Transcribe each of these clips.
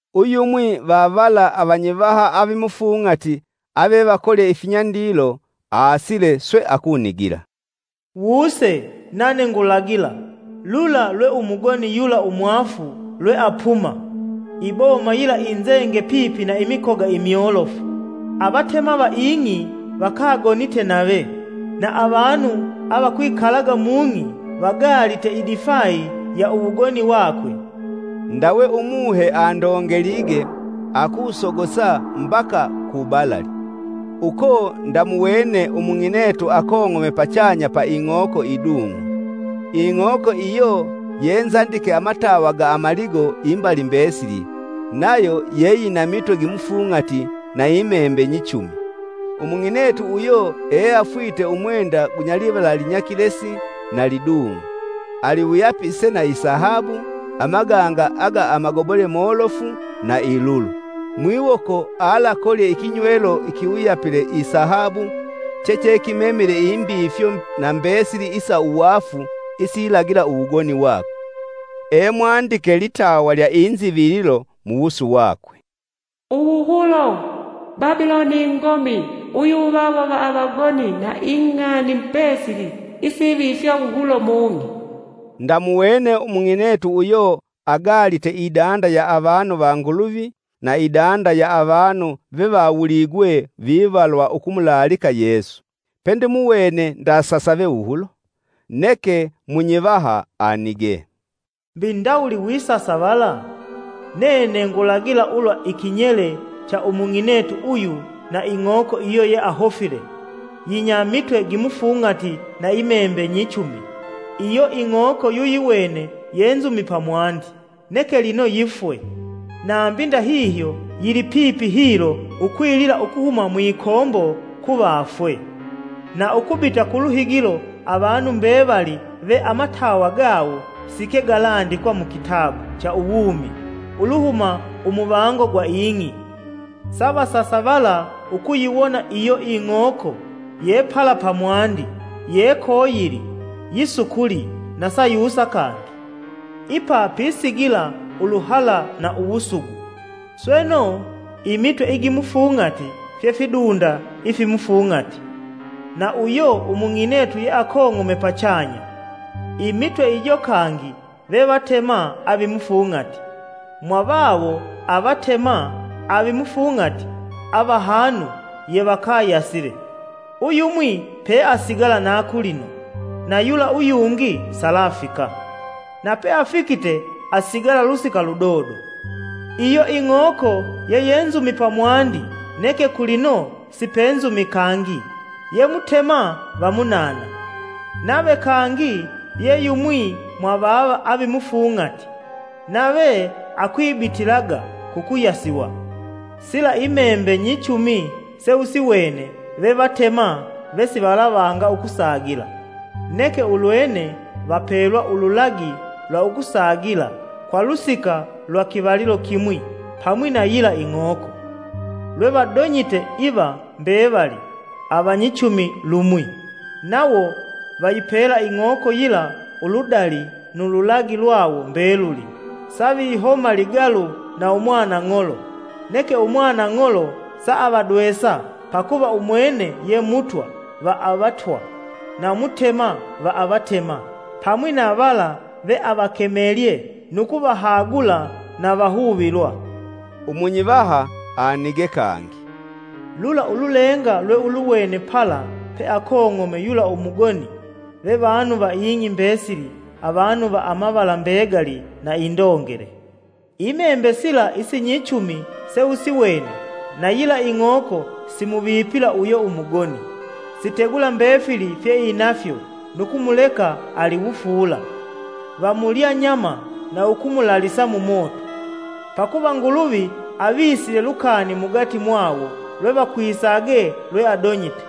Uyumwi va vala avanyivaha avimufung'ati avevakolye ifinyandilo aasile, swe akunigila, “Wuse, nane ngulagila, lula lwe umugoni yula umwaafu lweapuma, iboma yila inzenge pipi na imikoga imyolofu. Avatema va ing'i vakagonite nave; na avanu avakwikalaga mung'i vagalite idifai ya uwugoni wakwe.” Ndawe, Umuhe andongelige, akusogosa mbaka ku balali. Uko ndamuwene umung'inetu akong'ome pachanya pa ing'oko idung'u. Ing'oko iyo yenzandike amatawa ga amaligo imbali mbesili; nayo yeyina mitwe gimufung'ati na imembe nyichumi. Umung'inetu uyo eafwite umwenda gunya livala linyakilesi na lidung'u, aliwuyapise na isahabu, amaganga aga amagobole molofu na ilulu. Mwiwoko alakolye ikinywelo ikiwuyapile isahabu cheche kimemile imbifyo na mbesili isa uwaafu isilagila uwugoni wakwe. Emwandike litawa lya inzivililo muwusu wakwe, “Babiloni ingomi, uyuvawo va avagoni na ing'ani mbesili isivifya wuhulo mung'i.” Ndamuwene umung'inetu uyo agalite idanda ya avanu va Nguluvi, na idanda ya avanu vevawuligwe vivalwa ukumulaalika Yesu. Pendimuwene ndasasave wuhulo. Neke munyivaha anigee, “Mbi ndawuli wisasavala? Nene ngulagila ulwa ikinyele cha umung'inetu uyu na ing'oko iyo yeahofile yinya mitwe gimufung'ati na imembe nyichumi. Iyo ing'oko yuyiwene yenzumi pamwandi, neke lino yifwe. Nambi ndahihyo, yilipipi hilo ukwilila ukuhuma mwikombo kuvafwe, na ukubita kuluhigilo avanu mbevali ve amatawa gawo sike galandikwa mukitabu cha uwumi uluhuma umuvango gwa ing'i, savasasavala ukuyiwona iyo ing'oko ye pala pamwandi, yekoyili, yisukuli na sa yusa kangi. “Ipa pisigila uluhala na uwusugu! Sweno, imitwe igimufung'ati fye fidunda ifimufung'ati, na uyo umung'inetu yeakong'ome pachanya. Imitwe ijo kangi ve vatema avimufung'ati. Mwavawo avatema avimufung'ati, avahanu yevakayasile, uyumwi peasigala na kulino, na yula uyungi salafika; na peafikite asigala lusika ludodo. Iyo ing'oko yeye nzumi pamwandi neke kulino sipenzumi kangi ye mutema va munana, nave kangi yeyumwi mwavava avimufung'ati, nave akwibitilaga kukuyasiwa. “Sila imembe nyichumi seusiwene ve vatema vesivalavanga ukusagila. Neke ulwene vapelwa ululagi lwa ukusagila kwa lusika lwa kivalilo kimwi pamwi na yila ing'oko. Lwevadonyite iva mbevali avanyichumi lumwi, nawo vayipela ing'oko yila uludali nu lulagi lwawo mbeluli. Savihoma ligalu na umwanang'olo, neke umwanang'olo sa avadwesa pakuva umwene ye Mutwa va avatwa na Mutema va avatema. Pamwi na vala veavekemelye nu kuvahagula na vahuvilwa.” Umunyivaha anigee kangi, “Lula ululenga lweuluwene pala peakong'ome yula umugoni, ve vanu va ing'i mbesili, avanu va amavala mbegali, na indongele. Imembe sila isinyichumi seusiwene na yila ing'oko simuvipila uyo umugoni. Sitegula mbefili fyeinafyo nu kumuleka aliwufuula; vamulya nyama na ukumulalisa mumoto. Pakuva Nguluvi avisile lukani mugati mwawo lwevakwisage lweadonyite,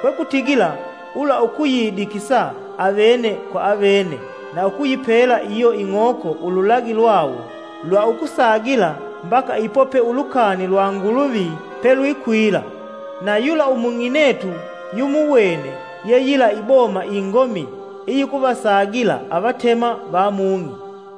kwekutigila ulwa ukuyidikisa avene kwa avene na ukuyipela iyo ing'oko ululagi lwawo lwa ukusagila, mbaka ipo pe ulukani lwa Nguluvi pelwikwila. “Na yula umung'inetu yumuwene ye yila iboma ingomi iyikuvasagila avatema va mung'i.”